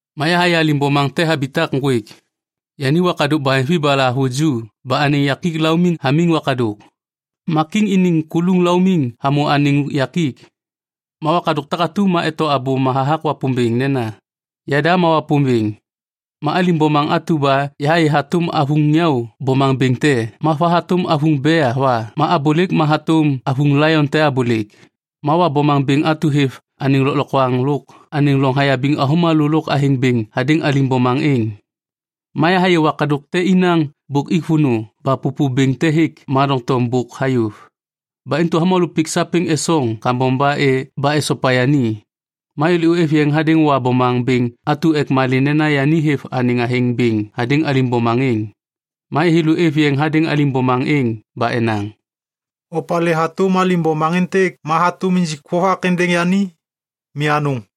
Ma yahayê alim bomaŋ te habitak ŋgwêk. Yani wakadôk baheŋvi ba lahavuju ba anêŋ yakik laumiŋ hamiŋ wakadôk. Ma kiŋ iniŋ kuluŋ laumiŋ hamô anêŋ yakik. Ma wakadôk takatu ma eto abôma hathak Wapômbêŋ nena, “Yada ma Wapômbêŋ”. Ma alim bomaŋ atu ba yahayê hatôm avuŋ nyau bomaŋ bêŋ te ma va hatôm avuŋ bea va ma abôlêk ma hatôm avuŋ laion te abôlêk. Ma Wa bomaŋ bêŋ atu hêv anêŋ lôklokwaŋ lôk anêŋ loŋ hayabiŋ avômalô lôk athêŋ bêŋ hadêŋ alim bomaŋ êŋ. Ma yahayê wakadôk te inaŋ bôk ik vônô ba pôpô bêŋ te hêk ma doŋtom bôk hayôv. Ba intu avômalô pik sapêŋ esoŋ kambom ba esopa yani. Ma thêlô êv yeŋ hadêŋ Wa bomaŋ bêŋ atu ek malê nena yani hêv anêŋ athêŋ bêŋ hadêŋ alim bomaŋ êŋ. Ma thêlô êv yeŋ hadêŋ alim bomaŋ êŋ ba enaŋ, “Opalê hatôm alim bomaŋ êntêk ma hatôm injik vovak êndêŋ yani? Mi anôŋ.”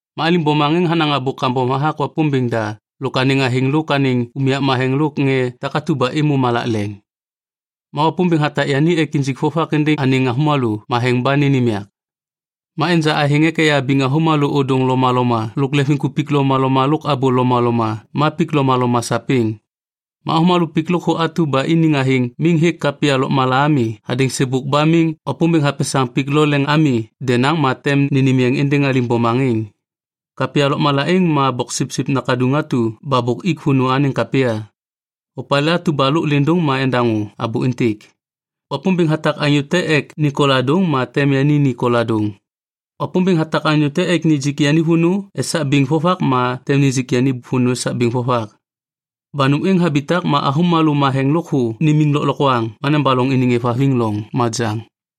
Ma alim bomaŋ êŋ hanaŋ abô kambom hathak Wapômbêŋ da lôk anêŋ athêŋ lôk anêŋ unyak matheŋ lôk ŋê takatu ba êmô malak leŋ. Ma Wapômbêŋ hatak yani ek injik vovak êndêŋ anêŋ avômalô matheŋ ba nênêm yak. Ma enja athêŋ ek eyabiŋ avômalô ôdôŋ lomaloma lôk leŋviŋkupik lomaloma lôk abô lomaloma ma pik lomaloma sapêŋ. Ma avômalô pik lôkthô atu ba iniŋ athêŋ miŋ hêk kapya lôkmala ami hadêŋ sêbôk ba miŋ Wapômbêŋ hapesaŋ pik lo leŋ ami denaŋ ma tem nênêm yeŋ êndêŋ alim bomaŋ êŋ. Kapya lôkmala êŋ ma Boksipsip Nakaduŋ atu ba bôk ik vônô anêŋ kapya. Opalê atu ba lôk lêndôŋ ma endaŋô abô êntêk. Wapômbêŋ hatak anyô te ek ni koladôŋ ma tem yani ni koladôŋ. Wapômbêŋ hatak anyô te ek nijik yani vônô esak biŋ vovak ma tem nijik yani vônô esak biŋ vovak. Ba nôm êŋ habitak ma avômalô matheŋ lôkthô nimiŋ lôklokwaŋ ma nebaloŋ iniŋ êvhaviŋ loŋ majaŋ.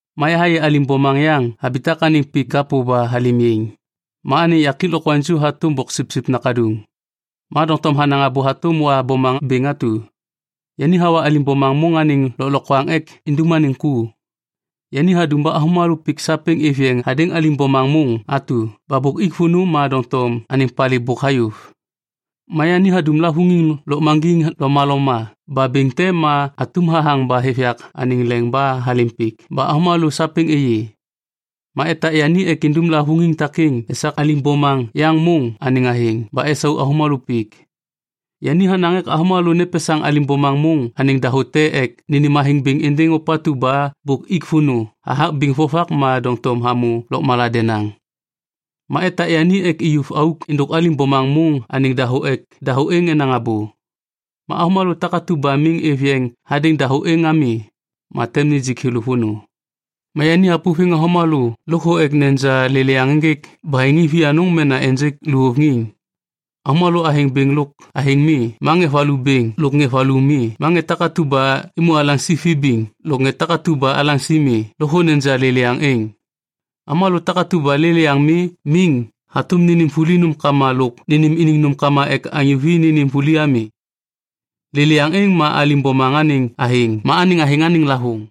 Ma yahayê alim bomaŋ yaŋ habitak anêŋ pik kapô ba halêm yaiŋ. Ma anêŋ yakik lokwaŋju hatôm boksipsip nakaduŋ. Ma doŋtom hanaŋ abô hatôm Wa bomaŋ bêŋ atu. Yani hawa alim bomaŋ môŋ anêŋ lôklokwaŋ ek indum anêŋ ku. Yani hadum ba avômalô pik sapêŋ êv yeŋ hadêŋ alim bomaŋ môŋ atu ba bôk ik vônô ma doŋtom anêŋ palê bôk hayôv. Ma yani hadum lavôŋiŋ lôkmaŋgiŋ lomaloma ba bêŋ te ma atum hathaŋ ba hêv yak anêŋ leŋ ba halêm pik ba avômalô sapêŋ êyê. Ma etak yani ek indum lavôŋiŋ takêŋ esak alim bomaŋ yaŋ môŋ anêŋ athêŋ ba esau avômalô pik. Yani hanaŋ ek avômalô nepesaŋ alim bomaŋ môŋ anêŋ dahô te ek nênêm athêŋ bêŋ êndêŋ ôpatu ba bôk ik vônô hathak biŋ vovak ma doŋtom hamô lôkmala denaŋ. Ma etak yani ek iyuv auk êndôk alim bomaŋ môŋ anêŋ dahô ek dahô êŋ enaŋ abô. Ma avômalô takatu ba miŋ êv yeŋ hadêŋ dahô êŋ ami, ma tem nijik thêlô vônô. Ma yani hapôviŋ avômalô lôkthô ek neja lêlêyaŋ ênjêk baheŋiŋ vianôŋ mena ênjêk luvôŋiŋ. Avômalô athêŋ bêŋ lôk athêŋ mi ma ŋê valu bêŋ lôk ŋê valu mi ma ŋê takatu ba êmô alaŋsi vibiŋ lôk ŋê takatu ba alaŋsi mi lôkthô neja lêlêyaŋ êŋ. Avômalô takatu ba lêlêyaŋ mi miŋ hatôm nênêm vuli nômkama lôk nênêm iniŋ nômkama ek anyô vi nênêm vuli ami. Lêlêyaŋ êŋ ma alim bomaŋ anêŋ athêŋ ma anêŋ athêŋ anêŋ lavôŋ.